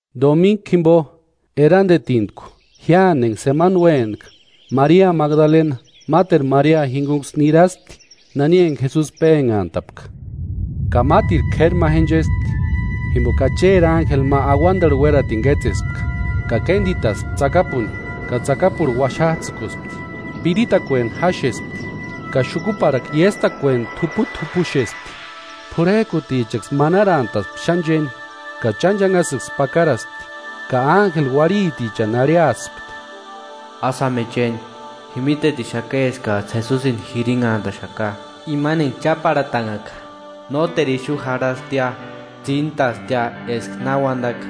Dominku jimpo, erantetintku jiáni enka semana uénak'a, Maria Magdalena máteru Maria jinkunksï niraspti nani enka Jesusi pénhantapka. Ka mátirku k'éri ma jenchespti, jimpoka Acheri ánjeli ma auantarhu uératini kétsespka, ka kéntitaspti tsakapuni ka tsakapurhu uaxats'ïkuspti. Piritakueni jáxespti ka xukuparhakua iéstakueni t'uput'upuxespti. P'urhek'utichaksï manarantaspti xáni chéni ka chánchanhasïksï pakaraspti. Ka ánjeli uarhitichani arhiaspti: “Ásï jáma je chéni, ji mítetixaka eskats'ï Jesusini jirinhantaxaka, imani enka cháparhatanhaka. Nóteru ixu jarhastia, tsíntastia eska na uantaka.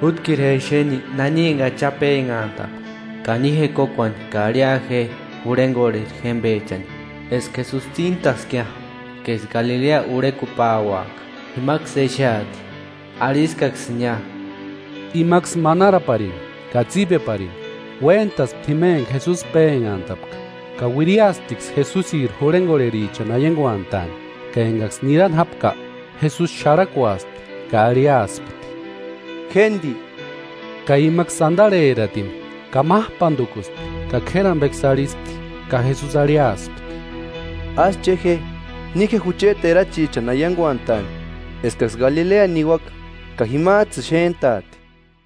Jútkiru je exeni nani enka Acha pénhantapka. Ka ni je kókuani ka arhia je jurhenkorheri jémpechani eska Jesusi tsíntaskiia, ka eska Galilea urhekupauaka, jimaksï exeati. Arhiskaksïnia.” Imaksï manaraparini ka tsípeparini uéntaspti jima enka Jesusi pénhantapka, ka uiriasptiksï Jesusiri jurhenkorherichani aiankuantaani, ka enkaksï nirani jápka, Jesusi xarhakuaspti ka arhiaspti: “Jénti”, ka imaksï antarheratini, kamap'antukuspti ka k'éri ampeksï arhispti. Ka Jesusi arhiaspti: “Ásï che je, ni je jucheti erachichani aiankuantaani eskaksï Galilea niuaka ka jimats'ïni xéntaati.”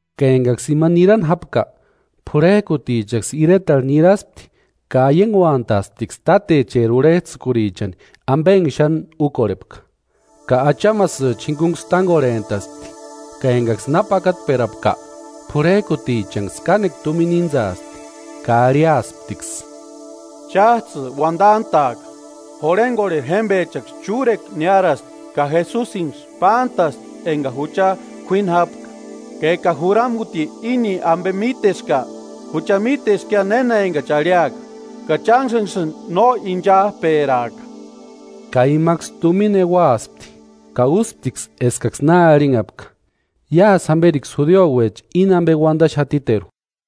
Ka enkaksï ima nirani jápka, p'urhek'utichaksï iretarhu niraspti ka aiankuantaasptiksï tátecheri urhets'ïkurichani ampe enka xáni úkorhepka. Ka achamasïcha jinkunksï tánkorhent'aspti ka enkaksï na pakatperapka, p'urhek'utichanksï kánekua tumina íntsaaspti ka arhiasptiksï: “Cháts'ï uantant'a'aka: ‘Jurhenkorheri jémpechaksï chúrekua niárasti ka Jesusinksï pántasti enkani jucha k'uíni jápka.’ Ka eka juramuti íni ampe míteska, jucha míteskia néna enkachi arhiaka, ka chánksïni no inchap'eraaka.” Ka imaksï tumina euaspti ka úsptiksï eskaksï na arhinhapka. Iásï jamperiksï judiuecha íni ampe uantaxatiteru.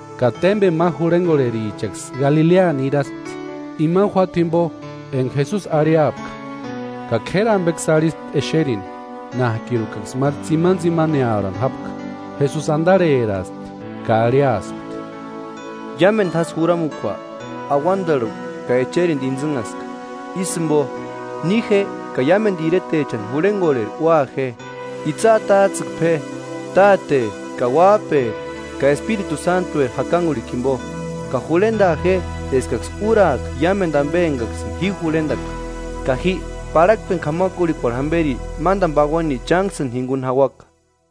Ka témpeni ma jurhenkorherichaksï Galilea niraspti, imani juáta jimpo enka Jesusi arhiapka. Ka k'éri ampeksï arhispti exerini, nák'irukaksï máru tsimantsimanearhani jápka. Jesusi antarheraaspti ka arhiaspti: “Iámentu jásï juramukua auantarhu ka echerintu intsïnhaska. Ísï jimpo, ni je ka iámentu iretechani jurhenkorheri ua je, itsï atats'ïkpe je Táteri ka Uáp'eri ka Espiritu Sántueri jakankurhikua jimpo. Ka jurhentaa je eskaksï úraaka iámentu ampe enkaksïni ji jurhentaka. Ka ji, parhakpeni k'amakurhikuarhu jamperi mántani pauani chánksïni jinkuni jauaka.”